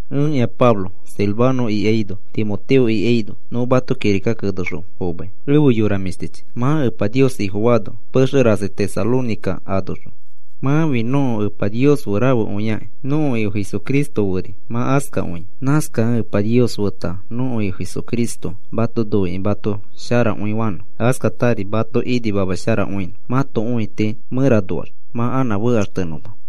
Ẽkĩa Pablo. Silvano ikaino Timoteo ikaino nõ mato kirika kenexõ fomai. Efe yora mĩshtichi, mã Epa Nios Ifofaano pexe rasi Tesalónica anoxõ, mãfi nõko Epa Nios fe rafekõiakĩ nõko Ifo Jesucristo feri mã askakõia. Nãskakẽ Epa Nios feta nõko Ifo Jesucristo mato noikĩ mato sharakõifanõ, askatari mato imasharakõinõ mãto õiti mẽranoax mã anã fekaxtenõma.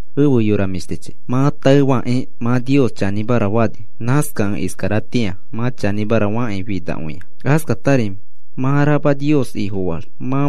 Efe yora mĩshtichi, mã taefakĩ mã Nios chanĩmara fani. Nãskakẽ iskaratĩa mã chanĩmara fakĩ finakõia. Askatari mã rama Nios Ifofaax mã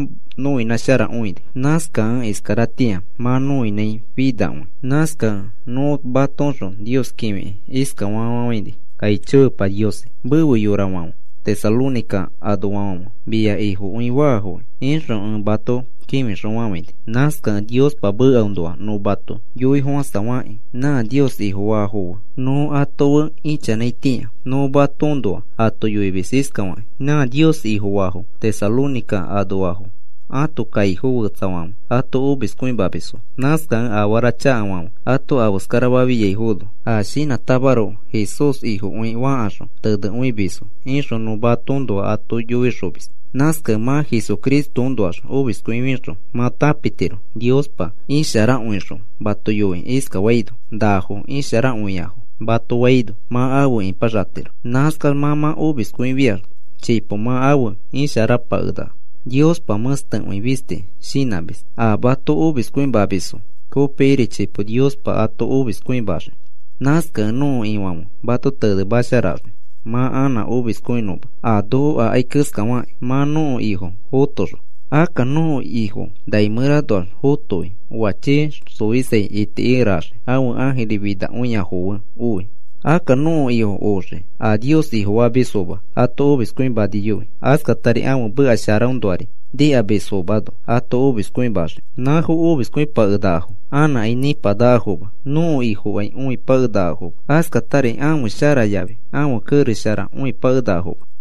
nõinãsharakõini. Nãskakẽ iskaratĩa mã nõinãifinakõi. Nãskakẽ nõ matoõxõ Nios kĩfikĩ iskafa fafafãini: “Aicho Epa Niosi, mefe yorafãfe Tesalónica anoafãfe mia Ifokõi faafoki,” ixõ ẽ mato kĩfixõfafãini. Nãskakẽ Niospa mekaõnoa nõ ato yoifofãsafakĩ nã Nios Ifofaafo fe nõ ato fe ichanãitĩa nõ matoõnoa ato yoimis iskafakĩ: “Nã Nios Ifofafo Tesalónica anoafo ãto kaifo fetsafãfe ato omiskõimamisfo. Nãskakẽ afara chakafãfe ato afeskarafafiaino a shinãtamaroko Jesús Ifokõi fakaxõ tenekõimisfo,” ixõ nõ matoõnoa ato yoixomis. Nãskakẽ mã Jesucristoõnoax omiskõifixõ mã tãpitiro Niospa isharakõixõ mato yoikĩ iskafaino: “Nafo isharakõiafo,” mato faino mã afe ipaxatiro. Nãskax mã mã omiskõifiax chipo mã afe isharapakenaka. Niospa mẽstekõi fisti shinãmis, a mato omiskõimamisfo kopikiri chipo Niospa ato omiskõimaxii. Nãskakẽ nõko Ifãfe mato tenemasharaxii mã anã omiskõinõma a noko akai keskafakĩ mã nõko Ifo fotoxõ. Akka nõko Ifo nai mẽranoax fotoi oa chii xoisai itikikeraxii ãfe ãjiri finakõiafo fe oi. Akka nõko Ifo oxii a Nios Ifofamisfoma ato omiskõimaniyoi, askatari ãfe meka sharaõnoari nikamisfomano ato omiskõimaxii. Nãfo omiskõipakenakafo, anãkai nĩpanakafoma. Nõko Ifokai õipakenakafoma, askatari ãfe shara yafi ãfe kerex shara õipakenakafoma.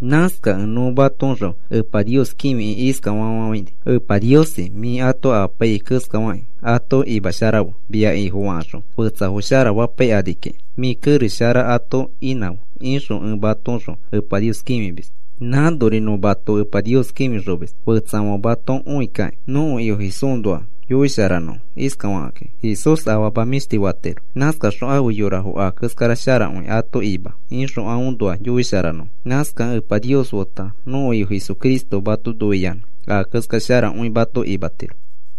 Nãskakẽ nõ matoõxõ Nios kĩfikĩ iskafa fafafãini: “Epa Niosi, mĩ ato imapaiyai keskafakĩ ato imasharafe mia Ifofakaxõ fetsafo sharafapaikani kiki mĩ kerex shara ato inãfe,” ixõ ẽ matoõxõ Epa Nios kĩfimis. Nãnori nõ mato Epa Nios kĩfixomis, fetsafãfe mato õikakĩ nõko Ifo Jesúsnoa yoisharanõfo iskafakakĩ: “Jesús afama mĩshti fatiro, nãskaxõ afe yorafo a keskara sharakõi ato ima,” ixõ aõnoa yoisharanõfo. Nãskakẽ Epa Nios feta nõko Ifo Jesucristo mato noiyanã a keskara sharakõi mato imatiro.